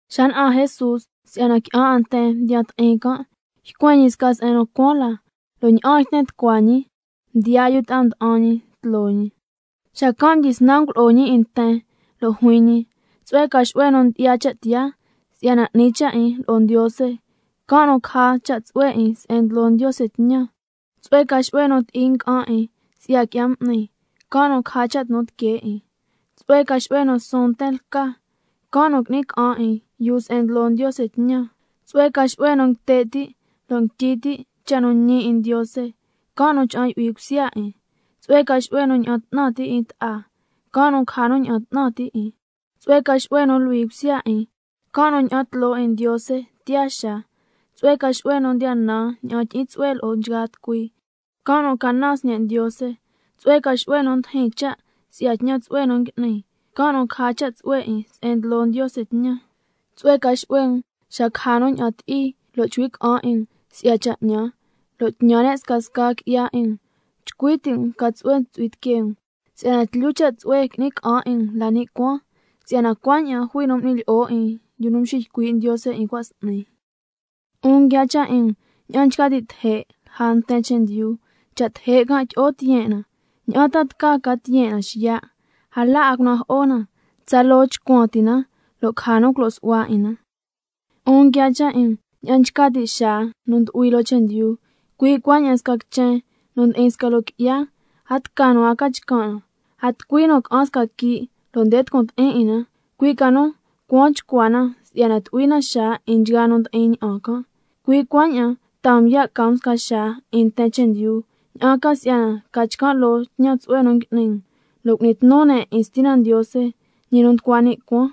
Xa na'an Jesús si'yana qui'an 'a nten mdiya ti'in can', ycuen ñi sca se'en nu cuaan la, lo' ña'aan yten tucua ñi mdiyaa yu ta'a nda'an ñi tloo ñi. Xacan' mdyisnan ngulo'o ñi 'in nten, lo' juin ñi: Tsu'hue ca xu'hue nu ndyi'ya cha' tiyaa si'yana 'ni cha' 'in lo'o Ndiose, can' nu caja cha' tsu'hue 'in se'en ndlo Ndiose tñan. Tsu'hue ca xu'hue nu ti'i nga'an 'in si'ya qui'ya m'ni, can' nu caja cha' tnu tiquee 'in. Tsu'hue ca xu'hue nu suun nten lca, can' nu qui'ni ca'an 'in yuu se'en ndlo Ndiose tñan. Tsu'hue ca xu'hue nu nguite' ti' lo' nguityi ti' cha' nu ñi 'in Ndiose, can' nu cha'an yu'hui cusya 'in. Tsu'hue ca xu'hue nu ña'an 'tnan ti' 'in ta'a, can' nu caja nu ña'an 'tnan ti' 'in. Tsu'hue ca xu'hue nu luhui cusya 'in, can' nu ña'an tloo 'in Ndiose tiyaa xaa. Tsu'hue ca xu'hue nu ndiya nan ña'an tyi'in tsu'hue lo'o nchgaa tucui, can' nu ca naan sñe' Ndiose. Tsu'hue ca xu'hue nu ndijin cha' si'ya tñan tsu'hue nu ngui'ni, can' nu caja cha' tsu'hue 'in se'en ndlo Ndiose tñan. Tsu'hue ca xu'hue um xa caja nu ña'an ti'i, lo' chcui' ca'an 'in um si'ya cha' 'ñan, lo' tñan ne' scasca qui'ya 'in um. Chcui ti' um lo' ca tsu'hue chu'hui tiquee um, si'yana tlyu cha' tsu'hue qui'ni ca'an 'in um la ni' cuaan, si'yana cuaña'an jui nu m'ni lyi'o 'in yu nu mxiycui' Ndiose 'in cua' s'ni. 'Un nguiaa cha' 'in um ña'an nchca ti' teje' lja nten chendyu, cha' teje' can' tyi'o tiyen' na, ¿ña'an ta tca ca tiyen' na xiya'? A la 'a cunajo'o na, tsaloo chcuan ti na lo' caja nu culo' su'hua 'in na. 'Un nguiaa cha' 'in um ña'an nchca ti' xaa nu ndu'hui loo chendyu, cui' cuaña'an sca quichen nu ndi'in sca loo qui'ya, a tca nu a ca chcan' na. A tucui nu ca'an sca quii' lo' nde tucun ti'in 'in na, cui' ca nu cuaan chcua na si'yana tu'hui na xaa 'in nchgaa nu ndi'in ña'an can'. Cui' cuaña'an taa um ya' ca um sca xaa 'in nten chendyu, ña'an ca si'yana ca chcan' loo tñan tsu'hue nu ngui'ni um, lo' cu'ni tnu ne' 'in Stina Ndiose, ñi nu nducua ni' cuaan.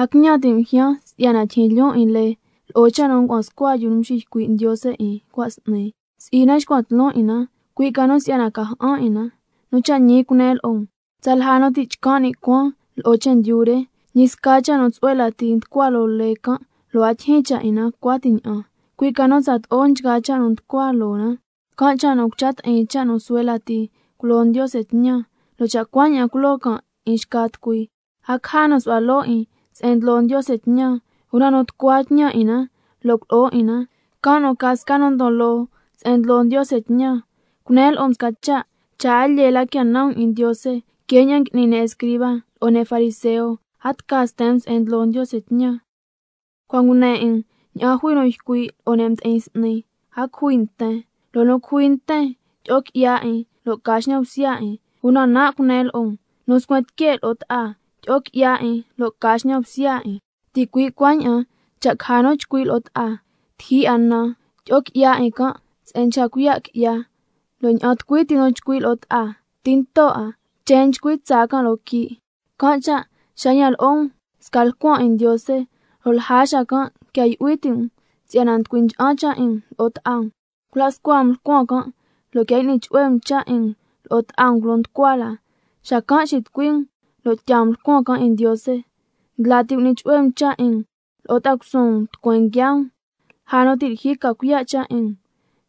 A quiñan ti' um ljyaan si'yana tyijyin lyoon 'in lee, lo'o cha' nu ngua'an scua yu nu mxiycui' Ndiose 'in cua' s'ni, si'i na xcuan tloon 'in na, cui' ca nu si'yana ca ja'an 'in na. Nu cha' ñi cunen lo'o um, tsalja nu ti' chcan' ni' cuaan lo'o chendyu re, ñi sca cha' nu suhue lati nducua loo lee can', lo' a tyijyin cha' 'in na cuati ña'an, cui' ca nu tsato'o nchgaa cha' nu nducua loo na. Can' cha' nu cucha ti'in cha' nu suhue lati ngulo Ndiose tñan, lo' cha' cuaña'an culo'o can' 'in xca tucui, a caja nu su'hua loo 'in se'en ndlo Ndiose tñan. Una nu tucua tñan 'in na lo' culo'o 'in na, can' nu ca sca nu ndon loo se'en ndlo Ndiose tñan. Cunen lo'o um sca cha', cha' a lyee la quia nan um 'in Ndiose que ña'an ngui'ni ne' escriba lo'o ne' fariseo, a tca sten um se'en ndlo Ndiose tñan. Cua' ngune 'in um ña'an jui nu ycui' lo'o ne' mdi'in s'ni: —A cujui nten—, lo' nu cujui nten tyi'o qui'ya 'in lo' ca xñan bsya 'in. Una nan' cunen lo'o um, nu nscuen tique' lo'o ta'a, tyi'o qui'ya 'in lo' ca xñan bsya 'in. Ticui' cuaña'an cha' caja nu chcui' lo'o ta'a: Tijyi 'a nan, tyi'o qui'ya 'in can' se'en nchca cuiya' qui'ya. Lo' ña'an tucui ti nu chcui' lo'o ta'a: Tinto 'a, chen nchcui tsaa can' loo quii'. Can' cha' xa yan lo'o um sca lcuan 'in Ndiose, lo' lja xacan' quia yu'hui ti' um si'yana nducui ncha'an cha' 'in um lo'o ta'a um, cula' scua um lcuan can', lo' quia y'ni chu'hue um cha' 'in um lo'o ta'a um culo nducua la, xacan' xitucui um, lo' tyaa um lcuan can' 'in Ndiose. Ndla ti cu'ni chu'hue um cha' 'in um lo'o ta'a cusuun um tucueen nguiaa um, lja nu ti' lyijyi ca cuiya' cha' 'in um,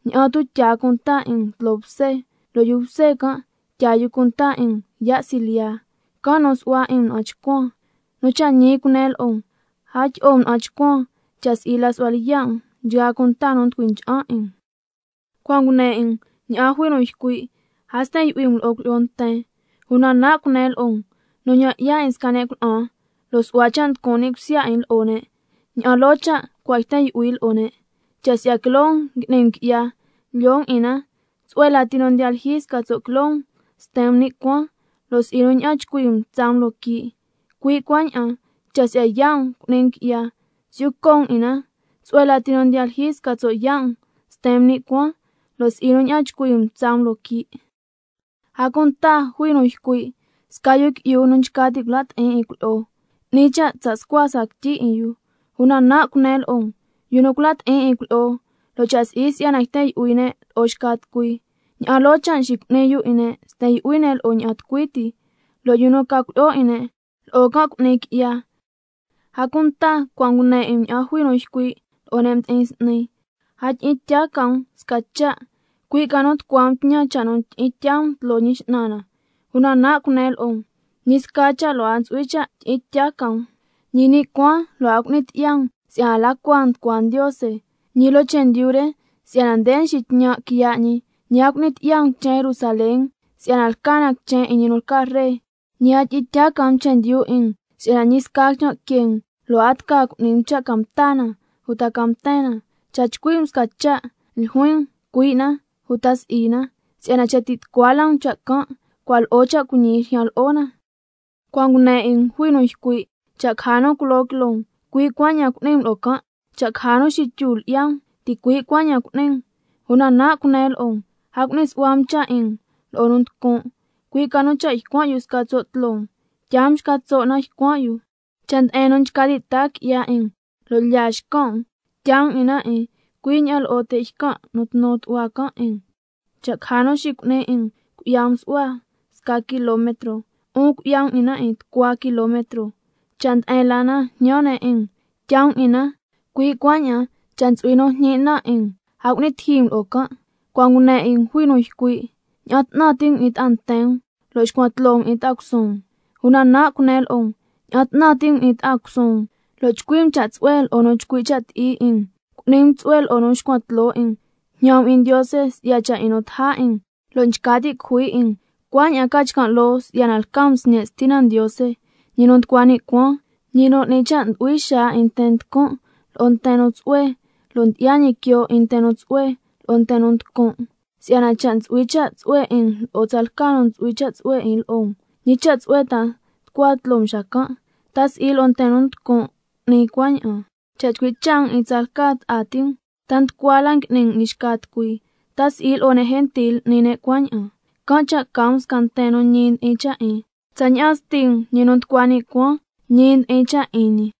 ña'an tu' tyaa can' cunta 'in um tloo bse, lo' yu bse can' tyaa yu cunta 'in um yaa' silyiya, can' nu su'hua 'in um na'an chcuan. Nu cha' ñi cunen lo'o um, a tyi'o um na'an chcuan, cha' si'i la su'hua lyiya' um nchgaa cunta nu nducui ncha'an 'in um. Cua' ngune 'in um ña'an jui nu ycui': —A sten yu'hui um lo'o cuilyi'o nten—. Una nan' cunen lo'o um, nu ñan' 'ya 'in sca ne' cuna'an, lo' su'hua cha' nducun' ni' cusya 'in lo'o ne', ña'an loo cha' cua' yten yu'hui lo'o ne'. Cha' si'ya quiloo um ngui'ni um qui'ya, lyoo um 'in na, tsu'hue lati nu ndiya lyijyi sca tso' quiloo um sten um ni' cuaan, lo' si'i nu ña'an chcui um tsaa um loo quii'. Cui' cuaña'an, cha' si'ya yaa' um cu'ni um qui'ya, si'yu co' um 'in na, tsu'hue lati nu ndiya lyijyi sca tso' yaa' um sten um ni' cuaan, lo' si'i nu ña'an chcui um tsaa um loo quii'. A cunta jui nu ycui': —Sca yu qui'yu nu nchca ti' cula' ti'in 'in cuilyi'o, 'ni cha' tsa' scua sca quityi 'in yu—. Una nan' cunen lo'o um, yu nu cula' ti'in 'in cuilyi'o, lo' cha' si'i si'yana yten yu'hui ne' lo'o xca tucui, ña'an loo cha' nxicu'ni yu 'in ne' sten yu'hui ne' lo'o ña'an tucui ti, lo' yu nu ca cuilyi'o 'in can', lo'o can' cu'ni qui'ya. A cunta cua' ngune 'in um ña'an jui nu ycui' lo'o ne' mdi'in s'ni: —A tyi'in tya ca um sca cha'—, cui' ca nu —tucua um tñan cha' nu tyi'in tyaa um tloo Ñi X'nan na—. Una nan' cunen lo'o um: Ñi sca cha' lo' a ntsu'hui cha' tyi'in tya ca um, ñi ni' cuaan lo' a cu'ni tyi'ya um si'yana la cua nducua Ndiose, ñi loo chendyu re si'yana nde nxitñan' quiya' ñi, ñi a cu'ni tyi'ya um quichen Jerusalén si'yana lca na quichen 'in ñi nu lca Ree. Ñi a tyi'in tya ca um chendyu 'in um, si'yana ñi sca quichan' que um lo' a tca cu'ni um cha' ca mta na uta ca mten na. Xa chcui' um sca cha', ljuin um: Cui' na, uta, si'i na, si'yana cha' ti' tucua la um cha' can', cua' lo'o cha' cuiñi ljyan lo'o na. Cua' ngune 'in um jui nu ycui': —Cha' caja nu culo quiloo um, cui' cuaña'an cu'ni um lo'o can', cha' caja nu xityu lyi'ya um, ticui' cuaña'an cu'ni um—. Una nan' cunen lo'o um, a cu'ni su'hua um 'in um lo'o nu nducun', cui' ca nu cha' ycuan' yu sca tso' tloo um, tyaa um xca tso' na ycuan' yu. Cha' nde'en nu nchca ti' taa qui'ya 'in um lo' lyaa xcan' um, tyaa um 'in na 'in cui' ña'aan lo'o te' ycan' tnu tu'hua can' 'in um. Cha' caja nu xicu'ni 'in um cui'ya um su'hua sca kilometro, 'un cui'ya um 'in na tucua kilometro. Cha' nde'en la na jñan ne' 'in um, tyaa um 'in na, cui' cuaña'an cha' ntsu'hui nu jñi' na 'in um, a cu'ni tiji um lo'o can'. Cua' ngune 'in um jui nu ycui': —Ña'an 'tnan ti' um 'in ta'a nten um—, lo' xcuan tloo um 'in ta'a cusuun um. Una nan' cunen lo'o um: Ña'an 'tnan ti' um 'in ta'a cusuun um, lo' chcui' um cha' tsu'hue lo'o nu nchcui' cha' ti'i 'in um, cu'ni um tsu'hue lo'o nu nxcuan tloo 'in um, jñan um 'in Ndiose si'ya cha' 'in nu ndaja 'in um lo' nducui ncha'an 'in um, cuaña'an ca chcan' loo si'yana lca um sñe' Stina Ndiose, ñi nu nducua ni' cuaan, ñi nu n'ni cha' ndu'hui xaa 'in nten nducun' lo'o nten nu tsu'hue, lo' nxi 'ya ñi quioo 'in nten nu tsu'hue lo'o nten nu nducun'. Si'yana cha' chu'hui cha' tsu'hue 'in um lo'o tsalca nu ntsu'hui cha' tsu'hue 'in lo'o um, ¿ñi cha' tsu'hue ta nducua tloo um xacan'? ¿Ta si'i lo'o nten nu nducun' n'ni cuaña'an? Cha' chcui' cha' um 'in tsalca ta'a ti um, ¿ta nducua la ngui'ni um 'in xca tucui? ¿Ta si'i lo'o ne' gentil n'ni ne' cuaña'an? Can' cha' ca um sca nten nu ñi ndi'in cha' 'in, tsaña'an Sti um ñi nu nducua ni' cuaan, ñi ndi'in cha' 'in ñi.